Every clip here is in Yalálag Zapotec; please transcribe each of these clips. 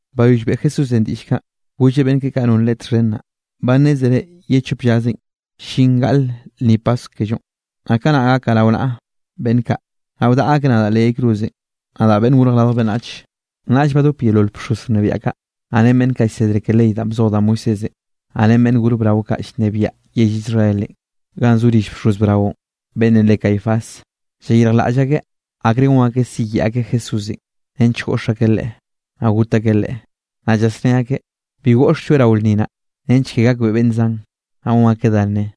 Bayoll beꞌe Jesúsenꞌ diꞌll kaꞌ, golleꞌ beꞌnn keꞌe kaꞌ non Leꞌe txhen naꞌ: —Ba nnézere ye chop llazenꞌ, llin gaꞌle lnni Paskw kellonꞌ. Naꞌ kanaꞌ gakaꞌ rao naꞌa beꞌnn kaꞌ, naꞌ wdaꞌa akeꞌ nadaꞌ leꞌ yay cruzenꞌ, nadaꞌ Beꞌnn Gorj Radj Beꞌnnach. Naꞌll badop yeolol bxoz wnebiaꞌ kaꞌ, naꞌ ren beꞌnn kaꞌ llsedre ke ley danꞌ bzoj da Moisésenꞌ, naꞌ ren beꞌnn gor brao kaꞌ llnebiaꞌ yell Israelenꞌ, ganꞌ zo rill bxoz braonꞌ, beꞌnnenꞌ re Caifás. Llayirjlaꞌll akeꞌ akre gon akeꞌ siyeꞌe akeꞌ Jesúsenꞌ, nench goꞌx akeꞌ Leꞌe, naꞌ got akeꞌ Leꞌe. Naꞌ llasné akeꞌ: —Bi goꞌxlloeꞌ rao lnni naꞌ, nench ke gakbeꞌe beꞌnn zan, naꞌ gon akeꞌ dá nne.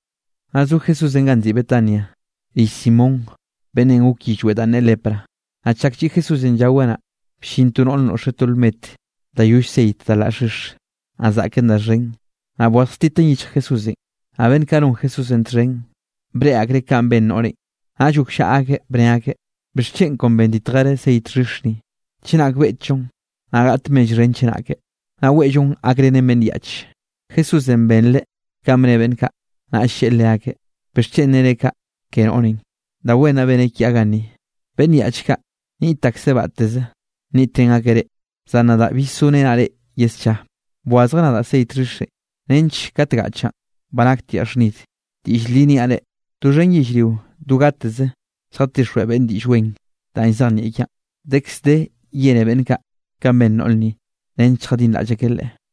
Naꞌ zo Jesúsenꞌ ganꞌ nziꞌi Betania, rill Simón beꞌnnenꞌ gok yillweꞌ danꞌ ne lepra. Naꞌ chak lliꞌ Jesúsenꞌ llaweꞌ naꞌ, bllin to noꞌr noꞌxeꞌ to lmet da yoll ceit da laꞌ xhix, naꞌ zaꞌken da xhen. Naꞌ bwazjtiteꞌn yichj Jesúsenꞌ. Naꞌ beꞌnn kaꞌ non Jesúsenꞌ txhen, breꞌe akreꞌ kanꞌ ben noꞌrenꞌ, naꞌll gokllaꞌa akeꞌ bne akeꞌ: —¿Bixchen kon benditjereꞌ ceit xhix ni? Chenak beꞌtllon, naꞌ gaꞌt mell xhen chenake, naꞌ weꞌllon gakrenen beꞌnn yaꞌch. Jesúsenꞌ benreꞌ kanꞌ bne beꞌnn kaꞌ, naꞌll lleꞌe leakeꞌ: —¿Bixchen nere kaꞌ ke noꞌrenꞌ? Da wen naꞌ beneꞌ kiaꞌ ganni. Beꞌnn yaꞌch kaꞌ, niꞌt akseꞌ batteze niꞌtrén akeꞌ reꞌ, zan nadaꞌ bill zorenaꞌ reꞌ ye scha. Bwazjeꞌ nadaꞌ ceit xhixenꞌ, nench kat gaꞌchaꞌn, ba naktiaꞌ xhnid. Diꞌll li niaꞌ reꞌ, doxhen yellrio do gateze lljatixjweꞌ beꞌnn Diꞌll Wen danꞌ llzejnieꞌ kiaꞌn, dekz de yene beꞌnn kaꞌ, kanꞌ ben noꞌr ni, nench lljadinraꞌll akeꞌ leꞌe.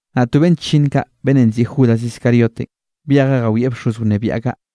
Naꞌ to beꞌnn chllinn kaꞌ, beꞌnnenꞌ nziꞌi Judas Iscariotenꞌ, byejeꞌ jawieꞌ bxoz wnebiaꞌ kaꞌ.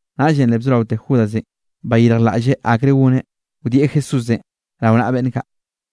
Naꞌllenꞌ le bzoraote Judasenꞌ bayirjlaꞌlleꞌ akre goneꞌ, wdieꞌ Jesúsenꞌ rao naꞌa beꞌnn kaꞌ.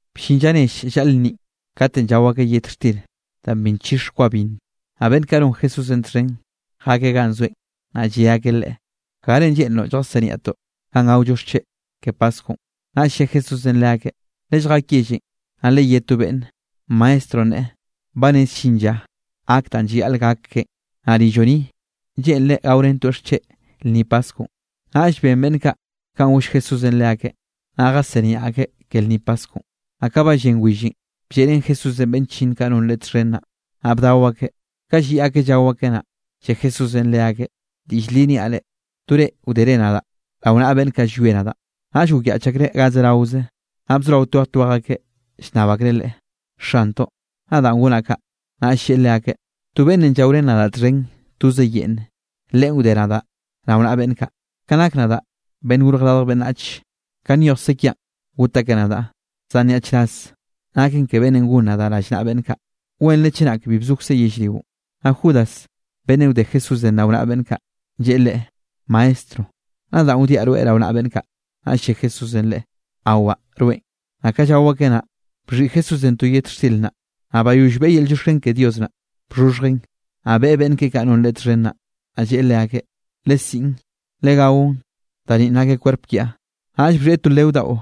Bllin lla nell llaꞌl lnni, katenꞌ llao akeꞌ yet xtir danꞌ bi nchix kwa binn, naꞌ beꞌnn kaꞌ non Jesúsenꞌ txhen, jakeꞌ ganꞌ zoeꞌ, naꞌ lle akeꞌ Leꞌe: —¿Garenꞌ lleꞌnroꞌ lljasiniaꞌtoꞌ ganꞌ gaollo xcheꞌ ke Paskwnꞌ? Naꞌll lle Jesúsenꞌ leakeꞌ: —Lelljak yellenꞌ, naꞌ leyé to beꞌnnenꞌ: “Maestronꞌ neꞌe, ba rez llin lla gak danꞌ llayaꞌl gak keꞌen, naꞌ rilloꞌ ni, lleꞌnreꞌ gaorentoeꞌ xcheꞌ lnni Paskwnꞌ.” Naꞌll ben beꞌnn kaꞌ kanꞌ goll Jesúsenꞌ leakeꞌn, naꞌ jasiniaꞌ akeꞌ ke lnni Paskwnꞌ. Naꞌ ka ba llen willenꞌ, blleꞌrén Jesúsenꞌ beꞌnn chllinn kaꞌ non Leꞌe txhen naꞌ, naꞌ bdao akeꞌ. Ka lliꞌ akeꞌ llao akeꞌ naꞌ, lle Jesúsenꞌ leakeꞌ: —Diꞌll li niaꞌ reꞌ, to reꞌ wdere nadaꞌ rao naꞌa beꞌnn kaꞌ llwie nadaꞌ. Naꞌll gokyaꞌch akreꞌ ga zeraoze, naꞌ bzorao twej twej akeꞌ llnnab akreꞌ Leꞌe: —Xantoꞌ, ¿nadaꞌn gonaꞌ kaꞌ? Naꞌll lleꞌe leakeꞌ: —To beꞌnnenꞌ llaorén nadaꞌ txhen toze yeꞌnne, leꞌen wde nadaꞌ rao naꞌa beꞌnn kaꞌ. Ka nak nadaꞌ, Beꞌnn Gorj Radj Beꞌnnach, ka nyojkze kiaꞌn got akeꞌ nadaꞌ, zan ¡nyaꞌchraz naken ke beꞌnnenꞌ gon nadaꞌ rallnaꞌa beꞌnn kaꞌ! Wenre chenak bi bzokzeꞌ yellrionꞌ. Naꞌ Judas beꞌnnenꞌ wde Jesúsenꞌ rao naꞌa beꞌnn kaꞌ, lleꞌe Leꞌe: —Maestro, ¿nadaꞌn wdiaꞌ rweꞌ rao naꞌa beꞌnn kaꞌ? Naꞌll lle Jesúsenꞌ leꞌe: —Awaꞌ, rweꞌn. Naꞌ ka llao akeꞌ naꞌ, bxhiꞌi Jesúsenꞌ to yet xtir naꞌ, naꞌ bayoll beꞌe yel llioxken ke Dios naꞌ, bxhoxhjeꞌn, naꞌ beꞌen beꞌnn keꞌe kaꞌ non Leꞌe txhen naꞌ, naꞌ lleꞌe leakeꞌ: —Lesiꞌn, legaon, da ninꞌ nake kwerp kiaꞌn. Naꞌll bxhieꞌ to leo daꞌo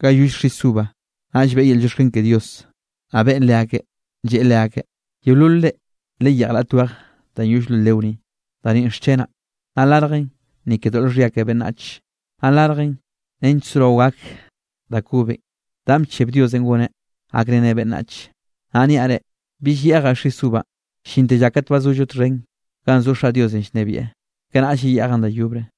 ganꞌ yoll xis uva, naꞌll beꞌe yel llioxken ke Dios, naꞌ beꞌen leakeꞌ, lleꞌe leakeꞌ: —Yeololre, leyeꞌj raꞌt weje danꞌ yoll lo leo ni. Da ninꞌ xchenaꞌ, naꞌ larjen ni ke doꞌl xhia ke beꞌnnach. Naꞌ larjen nench sorao gak da kobenꞌ, danꞌ bcheb Diosenꞌ goneꞌ gakreneꞌ beꞌnnach. Naꞌ niaꞌ reꞌ, bill yeꞌjaꞌ xis uvanꞌ, llinte lla kat ba zollo txhen ganꞌ zo Xaꞌ Diosenꞌ llnebieꞌ, kanaꞌll yeyeꞌjaꞌn da yobre.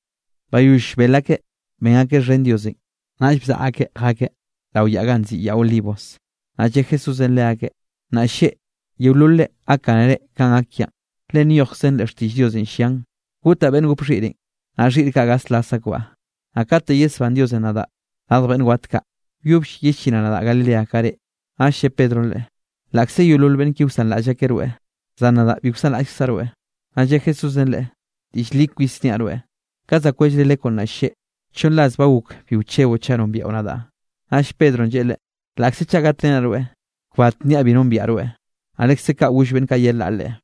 Bayoll bel akeꞌ ben akeꞌ xhen Diosenꞌ, naꞌll bzaꞌa akeꞌ jakeꞌ rao yaꞌ ganꞌ nziꞌi Yaꞌ Olivos. Naꞌ lle Jesúsenꞌ leakeꞌ: —Nnaꞌ lleꞌ, yeololre gakgánere kanꞌ gak kiaꞌn. Le nyojkzen leꞌ xtiꞌll Diosenꞌ llian: “Gotaꞌ beꞌnn gop xhiꞌrenꞌ, naꞌ xhiꞌr kaꞌ gaslas akbaꞌ.” Naꞌ kate yesbán Diosenꞌ nadaꞌ radj beꞌnn wat kaꞌ, wyobll yellinaꞌ nadaꞌ Galileanꞌ ka reꞌ. Naꞌll lle Pedronꞌ Leꞌe: —Laꞌkze yeolol beꞌnn ki wsanraꞌll akeꞌ rweꞌ, zan nadaꞌ bi wsanraꞌllkzaꞌ rweꞌ. Naꞌ lle Jesúsenꞌ leꞌe: —Diꞌll li kwis niaꞌ rweꞌ, ka za kwellre lekwnꞌ nnaꞌ lleꞌ, chonn ras ba gok bi wcheboꞌ chaꞌ nombiaꞌo nadaꞌ. Naꞌll Pedronꞌ lleꞌe Leꞌe: —Laꞌkze chaꞌ gatrenaꞌ rweꞌ, kbat nniaꞌ bi nombiaꞌ rweꞌ. Naꞌ lekze kaꞌ goll beꞌnn kaꞌ yelaꞌ Leꞌe.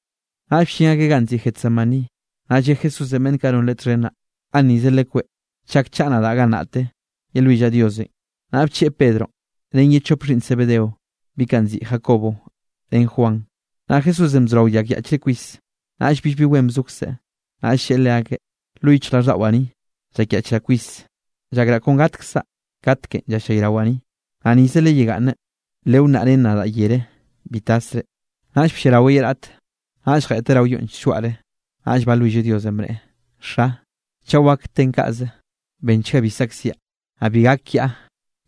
Naꞌll bllin akeꞌ ganꞌ nziꞌi Getsemaní, naꞌ lle Jesúsenꞌ beꞌnn kaꞌ non Leꞌe txhen naꞌ: —Gannize lekweꞌ, chak chaꞌa nadaꞌ gannaꞌte, yelwillaꞌ Diosenꞌ. Naꞌll bcheꞌe Pedronꞌ ren ye chop xhiꞌnn Zebedeo, bi kaꞌ nziꞌi Jacobo ren Juan. Naꞌ Jesúsenꞌ bzorao llakyaꞌchreꞌ kwis. Naꞌll billbi wen bzokzeꞌ. Naꞌll lleꞌe leakeꞌ: —Lo yichjraꞌlldaꞌwaꞌ ni, llakyaꞌchraꞌ kwis, llakraꞌ kon gatkzaꞌ katekenꞌ llallayrawaꞌ ni. Naꞌ nize leyegaꞌnne, lewnnaꞌ ren nadaꞌ yere bi tasre. Naꞌll blliaraweꞌ ye raꞌte, naꞌll jeꞌteꞌ rao yonꞌ slloaꞌre, naꞌll balwilleꞌ Diosenꞌ, bneꞌe: —Xa, chaꞌ wak ten kaꞌze, benchga bi saꞌkziaꞌ, naꞌ bi gak kiaꞌ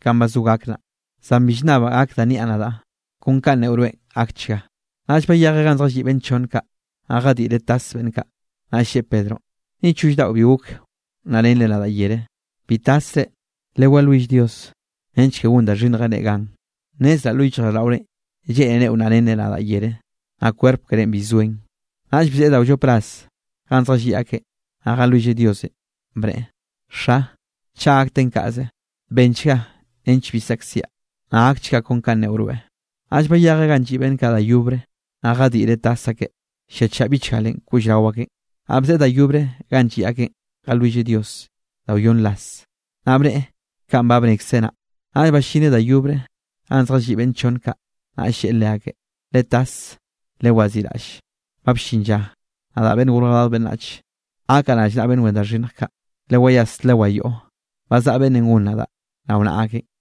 kanꞌ ba zo gak naꞌ. Zan bi llnnabaꞌ gak da nniaꞌ nadaꞌ, kon kaꞌ neꞌo rweꞌn gakchga. Naꞌll bayejeꞌ ganꞌ zjalliꞌ beꞌnn kaꞌ chonne, naꞌ jadiꞌreꞌ tas beꞌnn kaꞌ. Naꞌ lleꞌe Pedronꞌ: —¿Ni choll daꞌo bi gok wnnaꞌrenre nadaꞌ yere? Bi tasre, lewalwill Dios nench ke gon da xhinnjenꞌ reꞌ gan. Nnezraꞌ lo yichjraꞌlldaꞌorenꞌ lleꞌnere wnnaꞌrenre nadaꞌ yere, naꞌ kwerp kerénꞌ bi zoen. Naꞌll bzeꞌe da wllop ras ganꞌ zjalliꞌ akeꞌn naꞌ jalwilleꞌ Diosenꞌ, bneꞌe: —Xa, chaꞌ gak ten kaꞌze, benchga nench bi saꞌkziaꞌ, naꞌ gakchga kon kanꞌ neꞌo rweꞌ. Naꞌll bayejeꞌ ganꞌ lliꞌ beꞌnn kaꞌ da yobre, naꞌ jadiꞌreꞌ tas akeꞌ lliachaꞌ bichgalenꞌ koꞌll rao akeꞌn. Naꞌ bzeꞌe da yobre ganꞌ lliꞌ akeꞌn jalwilleꞌ Dios da wyonn ras, naꞌ bneꞌe kanꞌ ba bnekzeꞌ naꞌ. Naꞌll ballineꞌ da yobre ganꞌ zjalliꞌ beꞌnn chonn kaꞌ, naꞌll lleꞌe leakeꞌ: —¡Letas, lewaziꞌraꞌll! Ba bllin lla, nadaꞌ, Beꞌnn Gorj Radj Beꞌnnach, gakaꞌ rallnaꞌa beꞌnn wen da xhinnj kaꞌ. ¡Lewayas, lewayoꞌo! Ba zaꞌa beꞌnnenꞌ gon nadaꞌ rao naꞌa akeꞌn.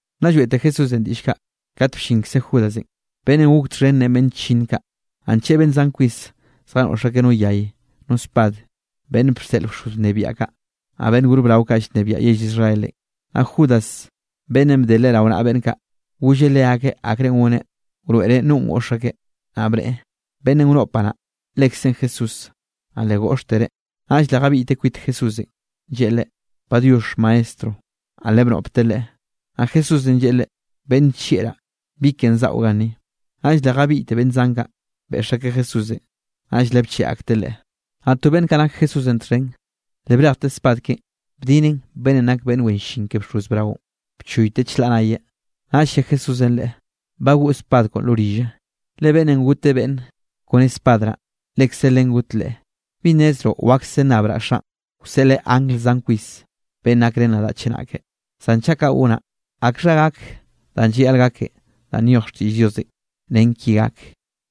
Nna lloeꞌte Jesúsenꞌ diꞌll kaꞌ, kat bllinkze Judasenꞌ, beꞌnnenꞌ gok txhen ren beꞌnn chllinn kaꞌ. Naꞌ ncheꞌe beꞌnn zan kwis zjanoꞌx akeꞌ no yay, no spad, beꞌnn bseꞌl bxoz wnebiaꞌ kaꞌ, naꞌ beꞌnn gor brao kaꞌ llnebiaꞌ yell Israelenꞌ. Naꞌ Judas beꞌnnenꞌ bde Leꞌe rao naꞌa beꞌnn kaꞌ, golleꞌ leakeꞌ akrenꞌ goneꞌ wroeꞌreꞌ nonꞌ goꞌx akeꞌ, naꞌ bneꞌe: —Beꞌnnenꞌ wnoꞌpaꞌ naꞌ, lekzeꞌn Jesúsenꞌ, naꞌ le goꞌxtereꞌ. Naꞌll le jabiꞌyteꞌ kwit Jesúsenꞌ, lleꞌe Leꞌe: —Padiox, Maestro. Naꞌ le bnoꞌpteꞌ Leꞌe. Naꞌ Jesúsenꞌ lleꞌe Leꞌe: —Beꞌnn nllieꞌraꞌ, ¿bi ken zaꞌo ganni? Naꞌll le jabiꞌyte beꞌnn zan kaꞌ, beꞌx akeꞌ Jesúsenꞌ, naꞌll le bcheꞌe akteꞌ Leꞌe. Naꞌ to beꞌnn nak Jesúsenꞌ txhen, le brejte spad keꞌen, bdineꞌn beꞌnnenꞌ nak beꞌnn wen llin ke bxoz braonꞌ, bchoyteꞌ chlaꞌ nayeꞌ. Naꞌll lle Jesúsenꞌ leꞌe: —Bagoꞌ spad koꞌon lo rille, le beꞌnn goteꞌ beꞌnn kone spad naꞌ, lekze len goten leꞌe. ¿Bi nnezroꞌ wakse nnabraꞌ Xaꞌn, wseꞌleꞌ angl zan kwis beꞌnn gakrén nadaꞌ chenake? Zan chaꞌ kaꞌ gonaꞌ, ¿akxha gak danꞌ llayaꞌl gaken danꞌ nyoj xtiꞌll Diosenꞌ nen kinꞌ gak?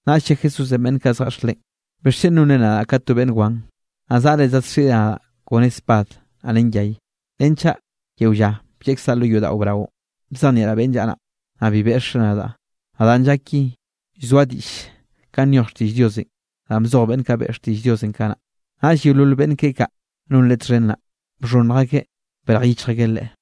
Naꞌll lle Jesúsenꞌ beꞌnn kaꞌ zjeꞌx Leꞌen: —¿Bixchen nonre nadaꞌ ka to beꞌnn wan, naꞌ zaꞌre zadxiꞌre nadaꞌ kone spad naꞌ ren yay? Renchaꞌ yeo lla blleꞌkzaꞌ lo yodaꞌo braonꞌ, bzejnieꞌraꞌ beꞌnne llaꞌa naꞌ, naꞌ bi beꞌxre nadaꞌ. Naꞌ danꞌ llak ki, llzoa diꞌll kanꞌ nyoj xtiꞌll Diosenꞌ, danꞌ bzoj beꞌnn kaꞌ beꞌe xtiꞌll Dios kanaꞌ. Naꞌll yeolol beꞌnn keꞌe kaꞌ non Leꞌe txhen naꞌ, bxhonnj akeꞌ brej yichj akeꞌ Leꞌe.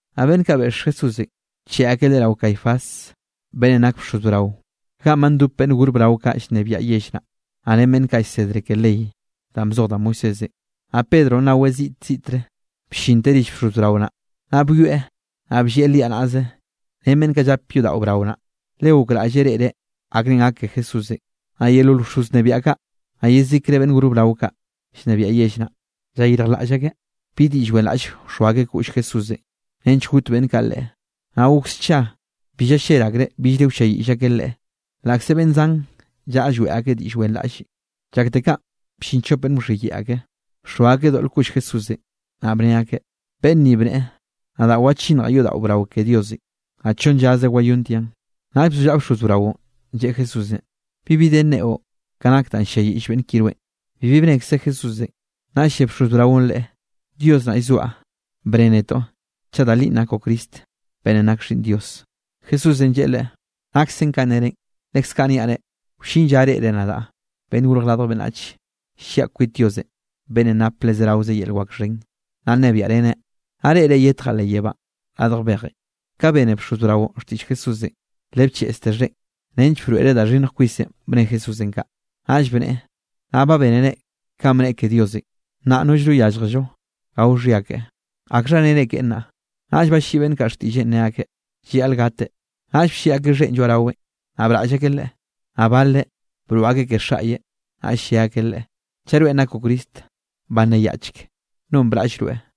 Naꞌ beꞌnn kaꞌ beꞌx Jesúsenꞌ, bcheꞌe akeꞌ Leꞌe rao Caifás, beꞌnnenꞌ nake bxoz brao, ganꞌ ba ndop beꞌnn gor brao kaꞌ llnebiaꞌ yell naꞌ, naꞌ ren beꞌnn kaꞌ llsedre ke ley danꞌ bzoj da Moisésenꞌ. Naꞌ Pedronꞌ naweꞌ ziꞌt ziꞌtre, bllinteꞌ rill bxoz brao naꞌ, naꞌ byoeꞌ naꞌ bllieꞌ liaꞌ naꞌze ren beꞌnn kaꞌ llap yodaꞌo brao naꞌ, le gokraꞌlleꞌ reꞌreꞌ akrenꞌ gak ke Jesúsenꞌ. Naꞌ yeolol bxoz wnebiaꞌ kaꞌ, naꞌ yezikre beꞌnn gor brao kaꞌ llnebiaꞌ yell naꞌ, llayirjlaꞌll akeꞌ bi diꞌll wenraꞌllenꞌ wxoa akeꞌ koꞌll Jesúsenꞌ, nench got beꞌnn kaꞌ Leꞌe. Naꞌ gok scha, bi ballel akereꞌ billre wlliayiꞌll akeꞌ Leꞌe, laꞌkze beꞌnn zan llaꞌa lloeꞌ akeꞌ diꞌll wenraꞌllenꞌ. Llakte kaꞌn bllin chop beꞌnn wxhiyeꞌe ake, bxoa akeꞌ doꞌl koꞌll Jesúsenꞌ. Naꞌ bne akeꞌ: —Beꞌnn ni bneꞌe: “Nadaꞌ wachinnjaꞌ yodaꞌo brao ke Diosenꞌ, naꞌ chonn llaze wayontiaꞌn.” Naꞌll bzollaꞌa bxoz braonꞌ, lleꞌe Jesúsenꞌ: —¿Bibi de nneꞌo, ka nak danꞌ ll-lliayiꞌll beꞌnn ki rweꞌn? Bibi bnekze Jesúsenꞌ. Naꞌll lle bxoz braonꞌ Leꞌe: —Dios naꞌ llzoaꞌ, bnne netoꞌ, chaꞌ da linꞌ nakoꞌ Cristo beꞌnnenꞌ nak Xhiꞌnn Dios. Jesúsenꞌ lleꞌe leꞌe: —Naksen kanꞌ nere, leskaꞌ niaꞌ reꞌ, wllin lla reꞌre nadaꞌ, Beꞌnnenꞌ Gorj Radj Beꞌnnach, lliaꞌ kwit Diosenꞌ beꞌnnenꞌ nape le zerawe yel wak xhen, naꞌ nnebiaꞌreneꞌ, naꞌ reꞌre yetjaꞌ leꞌ yebánꞌ radj bejenꞌ. Ka bene bxoz braonꞌ xtiꞌll Jesúsenꞌ, le bcheꞌzte xheꞌen, nench broeꞌreꞌ da xhinnj kwisenꞌ bne Jesúsenꞌ kaꞌ. Naꞌll bneꞌe: —Nnaꞌ ba bénere kanꞌ bnneꞌe ke Diosenꞌ, nnaꞌ nollno yálljello gao xhia keꞌe. ¿Akxha nere keꞌe nnaꞌ? Naꞌll balliꞌi beꞌnn kaꞌ xtiꞌlleꞌn ne akeꞌ: —Llayaꞌl gateꞌ. Naꞌll blliꞌ akeꞌ xheꞌn lloaꞌ raweꞌn, naꞌ braꞌll akeꞌ Leꞌe, naꞌ baleꞌ broꞌ akeꞌ ke xaꞌye. Naꞌll lle akeꞌ Leꞌe: —Chaꞌ rweꞌn nakoꞌ Cristo, banneyaꞌchk, ¿nonꞌ braꞌll rweꞌ?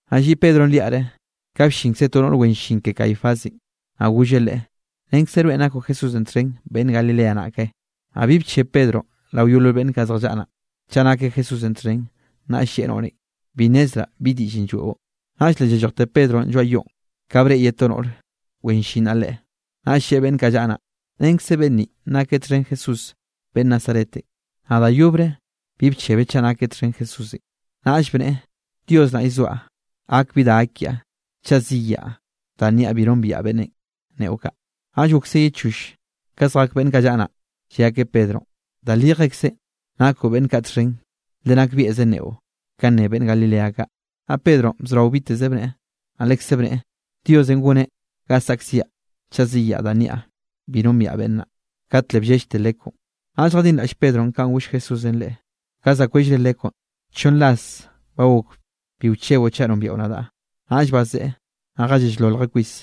Naꞌ lliꞌ Pedronꞌ liaꞌre, ka bllinkze to noꞌr wen llin ke Caifásenꞌ, naꞌ golleꞌ leꞌe: —Renkze rweꞌn nakoꞌ Jesúsenꞌ txhen, beꞌnn Galilea naꞌ, ke. Naꞌll bi bcheb Pedronꞌ rao yeolol beꞌnn kaꞌ zjallaꞌa naꞌ, chaꞌ nakeꞌ Jesúsenꞌ txhen, naꞌll lleꞌe noꞌrenꞌ: —Bi nnezraꞌ bi diꞌllenꞌ lloeꞌo. Naꞌll le llallojte Pedronꞌ lloaꞌ yoꞌn, ka breꞌe ye to noꞌr wen llin naꞌ leꞌe, naꞌll lleꞌe beꞌnn kaꞌ llaꞌa naꞌ: —Renkze beꞌnn ninꞌ nakeꞌ txhen Jesús beꞌnn Nazaretenꞌ. Naꞌ da yobre bi bchebeꞌ chaꞌ nakeꞌ txhen Jesúsenꞌ. Naꞌll bneꞌe: —Dios naꞌ llzoaꞌ, gak bi da gak kiaꞌ, chaꞌ ziyaꞌ danꞌ niaꞌ bi nombiaꞌ beꞌnnenꞌ neꞌo kaꞌ. Naꞌll gokse ye choll, ka zjak beꞌnn kaꞌ llaꞌa naꞌ, lle akeꞌ Pedronꞌ: —Da lijekzenꞌ, nakoꞌ beꞌnn kaꞌ txhen, le nakbieꞌze nneꞌo kanꞌ nne beꞌnn Galilea kaꞌ. Naꞌ Pedronꞌ bzorao biteze bneꞌe, naꞌ leskaꞌ bneꞌe: —Diosenꞌ goneꞌ ga saꞌkziaꞌ chaꞌ ziyaꞌ danꞌ niaꞌ bi nombiaꞌ beꞌnn naꞌ. Kat le bllellte lekwnꞌ. Naꞌll jadinraꞌll Pedronꞌ kanꞌ goll Jesúsenꞌ leꞌe: “Ka za kwellre lekwnꞌ, chonn ras ba gok bi wcheboꞌ chaꞌ nombiaꞌo nadaꞌ.” Naꞌll bazeꞌe, naꞌ jallell-loljeꞌ kwis.